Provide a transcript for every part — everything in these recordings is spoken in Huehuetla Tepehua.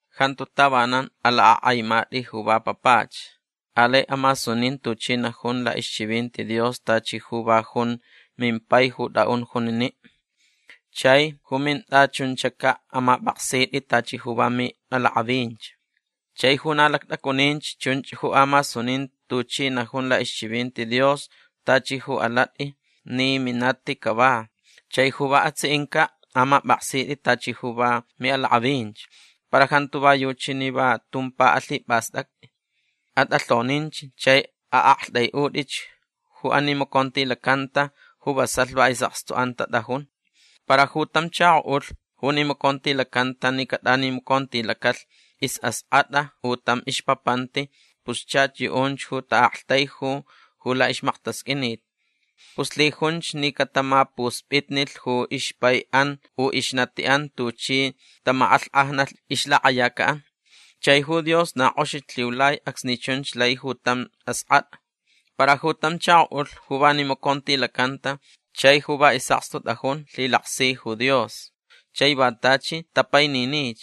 Jantu tavanan alakʼakʼaimatʼi ju va papach. Alai amasunin tuchi najun laʼixchivinti Dios tachi ju va junch mimpai ju tʼaʼun juniniʼ. Chai ju mintʼachuncaʼ amapʼaksitʼi tachi ju va miʼalakʼavinch. Chai ju na lactʼacuninch chunch ju amasunin tuchi najun laʼixchivinti Dios tachi ju alatʼi ni minati cava. Chai ju va atsiʼincaʼ amapʼaksitʼi tachi ju va miʼalakʼavinch. Para jantu va yuchi ni va tumpa alhipʼastʼactʼi. Atʼalhoninch chai aʼaktʼaiʼutʼich ju animacontilacanta ju vasalh va isʼakstuʼan tatʼajun. Para ju tam chakoʼulh ju nimacontilacanta ni catʼanimacontilacalh isʼaskʼatʼa u tam ixpapanti pus chach yuʼunch ju taʼaktaiju ju laʼixmaktasqʼuinit. Pus lhijunch ni catamapuspʼitnilh ju ixpaiʼan u ixnatiʼan tuchi tamakʼalhkʼajnalh ixlakʼayacaʼan. Chai ju Dios na kʼoxich lhiulai acsni chunch lai ju tam askʼatʼa. Para ju tam chakoʼulh ju va nimacontilacanta chai ju va isʼakstu tʼajun lhilaksi ju Dios chai va tachi tapaininich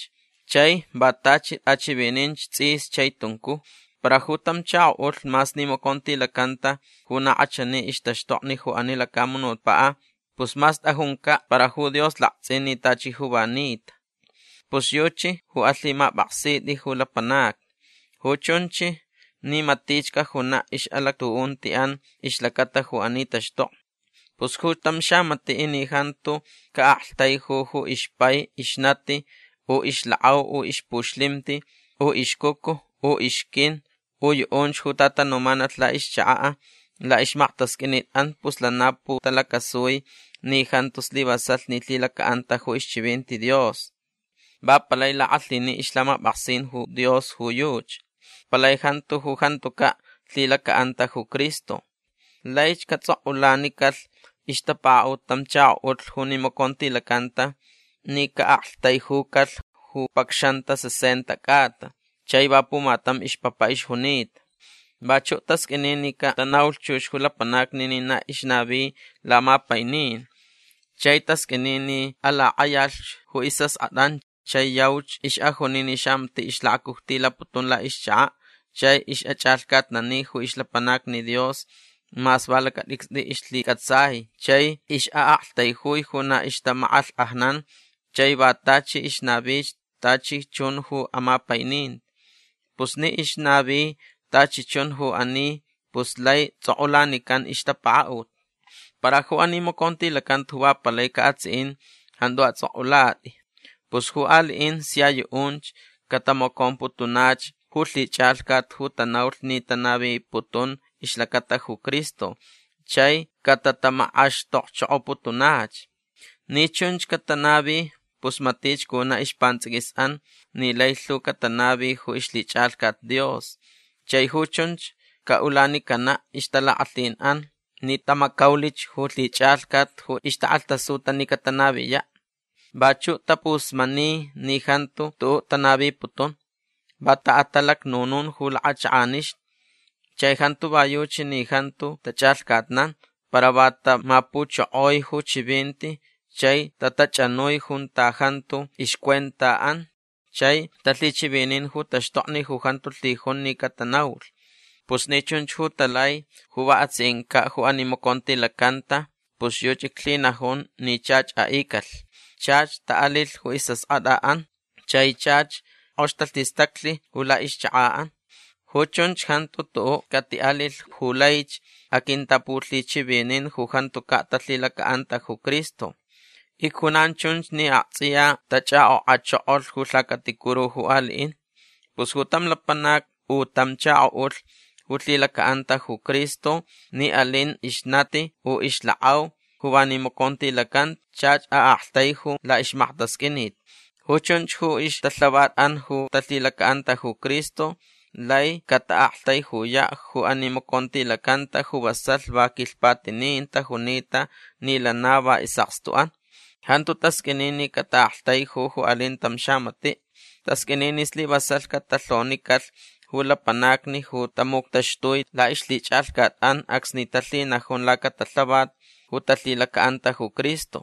chai va tachi tʼachivininch tsʼis chai tuncuj. Para ju tam chakoʼulh mas nimacontilacanta ju na kʼachani ixtaxtokni ju ani lacamunutpaʼ pus mas tʼajuncaʼ para ju Dios laktsʼin ni tachi ju va nita. Pus yuchi ju alhimapʼaksitʼi ju lapanacni. Ju chunch ni matich cajunaʼ ixʼalactuʼuntiʼan ixlacata ju ani taxtokni. Pus ju tam xamatiʼ ni jantu caʼaktaiju ju ixpai ixnati u ixlakʼau u ixpuxlimti u ixcucu u ixquin u yuʼunch ju tatanumanalh laʼixchakaʼ laʼixmaktasqʼuinitʼan pus lana putalacasui ni jantu slivasalh ni lhilacaʼanta ju ixchivinti Dios. Va palai lakʼalhini ixlhamapʼaksin ju Dios ju yuchi. Palai jantu ju jantucaʼ lhilacaʼanta ju Cristo. Laich catsʼokʼulanicalh ixtapakaʼut tam chakoʼulh ju nimacontilacanta ni caʼaktaijucalhch ju pacxanta sesenta cʼata chai va pumatam ixpapa ixjunita. Vachuʼ tasqʼuini ni catanaulh chux ju lapanacni ni na ixnavi lamapainin. Chai tasqʼuini ni alakʼayalh ju isʼaskʼatʼan chai yauch ixʼajuni ni xamatiʼ ixlakacujtilaputun laʼixchakaʼ chai ixʼachʼalhcatnani ju ixlapanacni Dios mas va lacatʼicstʼi ixlhicʼatsai chai ixʼaʼaktaijui ju na ixtamakʼalhkʼajnan chai va tachi ixnavich tachi chun ju amapaininti. Pus ni ixnavi tachi chun ju ani pus lai tsʼokʼulanican ixtapakaʼut. Para ju animacontilacanta ju va palaicaʼ atsiʼin jantu atsʼokʼulatʼi. Pus ju aliʼin sia yuʼunch catamacomputunach ju lhichʼalhcat ju tanaulh ni tanaviputun ixlacata ju Cristo chai catatamakʼaxtokchokoputunach. Ni chunch catanavi pus matich cunaʼ ispantsʼiquisʼan ni lai lhu catanavi ju ixlhichʼalhcat Dios. Chai ju chunch caʼulanicanaʼ ixtalakʼalhinʼan ni tamacaulich ju lhichʼalhcat ju ixtakʼalhtasuta ni catanaviyaʼ. Vachuʼ tapusmani ni jantu tuʼuʼ tanaviputun. Va taʼatalacnunun ju lakʼachakʼanixni. Chai jantu va yuchi ni jantu tachʼalhcatnan para va tamapuchokoi ju chivinti chai tatachʼanui junta jantu ixcuentaʼan chai talhichivinin ju taxtokni ju jantu lhijun ni catanaulh. Pus ni chunch ju talai ju va atsiʼincaʼ ju animacontilacanta pus yuchi iclhinajun ni chach aʼicalh. Chach taʼalilh ju isʼaskʼatʼaʼan chai chach kʼox talhistaclh ju laʼixchakaʼan. Ju chunch jantu tuʼuʼ catiʼalilh ju laich aquintapulhichivinin ju jantucaʼ talhilacaʼanta ju Cristo. Icjunan chunch ni aktsʼiya tachʼakʼokʼachokolh ju lhacaticuru ju aliʼin. Pus ju tam lapanac u tam chakoʼulh ju lhilacaʼanta ju Cristo ni alin ixnati u ixlakʼau ju va nimacontilacanta chach aʼaktaiju laʼixmaktasqʼuinit. Ju chunch ju ixtalhavatʼan ju talhilacaʼanta ju Cristo lai cataʼaktaijuyaʼ ju animacontilacanta ju vasalh va quilhpatinin tajunita ni lana va isʼakstuʼan. Jantu tasqʼuini ni cataʼaktaiju ju alin tam xamatiʼ. Tasqʼuini ni slivasalh catalhonicalh ju lapanacni ju tamuctaxtui laʼixlhichʼalhcatʼan acsni talhinajun lacatalhavat ju talhilacaʼanta ju Cristo.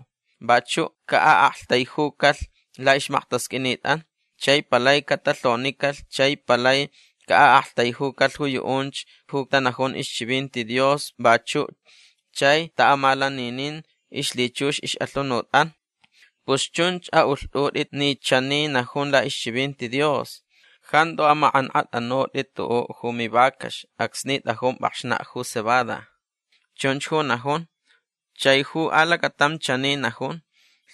Vachuʼ caʼaʼaktaijucalh laʼixmaktasqʼuinitʼan. Chai palai catalhonicalh chai palai caʼaʼaktaijucalh ju yuʼunch ju tanajun ixchivinti Dios vachuʼ chai taʼamalaninin ixlhichux ixʼalhunutʼan. Pus chunch aʼulhtʼutʼi ni chani najun laʼixchivinti Dios: “Jantu amakʼankʼatʼanutʼi tuʼuʼ ju mivacax acsni tʼajun pʼakxnaʼ ju cebada”. Chunch ju najun. Chai ju alacatam chani najun: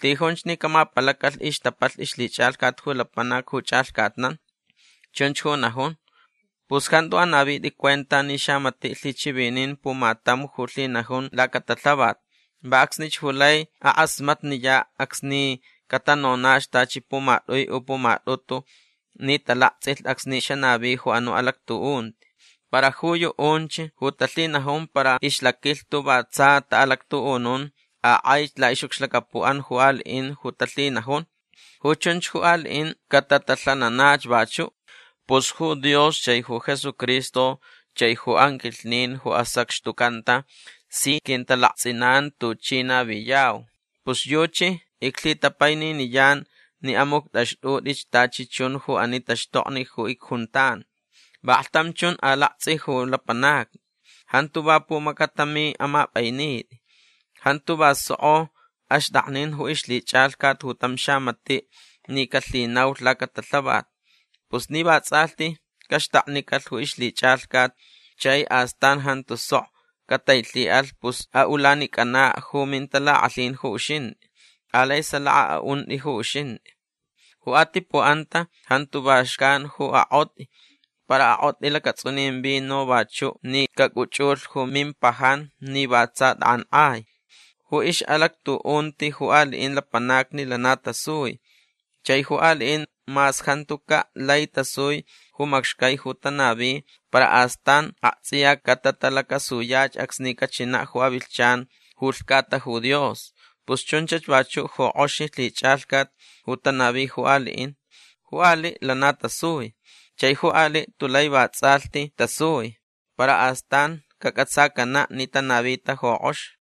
“Lhijunch ni camapalacalh ixtapalh ixlhichʼalhcat ju lapanac ju chʼalhcatnan”. Chunch ju najun. Pus jantu anavitʼi cuenta ni xamatiʼ lhichivinin pumatam ju lhinajun lacatalhavat. Va acsnich ju lai akʼasmatniyaʼ acsni catanonach tachi pumatʼui u pumatʼutu ni talaktsʼilh acsni xanavi ju anuʼ alactuʼunti. Para ju yuʼunch ju talhinajun para ixlaquilhtu va tsa taʼalactuʼunun akʼaich laʼixʼucxlacapuʼan ju aliʼin ju talhinajun. Ju chunch ju aliʼin catatalhananach vachuʼ. Pus ju Dios chai ju Jesucristo chai ju anquilhnin ju asacxtucanta si quintalaktsʼinan tuchi naviyau. Pus yuchi iclhitapaininiyan ni amuctʼaxtʼutʼich tachi chun ju ani taxtokni ju icjuntan. Vaklhtam chun alaktsʼi ju lapanacni. Jantu va pumacatami amapʼainitʼi. Jantu va sokʼo axtʼaknin ju ixlhichʼalhcat ju tam xamatiʼ ni calhinaulh lacatalhavat. Pus ni vatsʼalhti caxtaknicalh ju ixlhichʼalhcat chai astan jantu sok catailhiʼalh pus aʼulanicʼanaʼ ju mintalakʼalhin ju uxintʼi. Alai salaka aʼuntʼi ju uxintʼi. Ju atipuʼanta jantu va xcan ju akʼotʼi. Para akʼotʼi lacatsʼunin vino vachuʼ ni cacʼuchʼulh ju mimpajan ni va tsa tʼakʼankʼai. Ju ixʼalactuʼunti ju aliʼin lapanacni lana tasui. Chai ju aliʼin mas jantucaʼ lai tasui ju macxcai ju tanavi para astan aktsʼiya catatalacasuyach acsni cachinaʼ ju avilhchan ju lhcata ju Dios. Pus chunchach vachuʼ ju kʼoxi lhichʼalhcat ju tanavi ju aliʼin. Ju aliʼ lana tasui. Chai ju aliʼ tulai vatsʼalhti tasui. Para astan cacʼatsacanaʼ ni tanavita ju kʼox.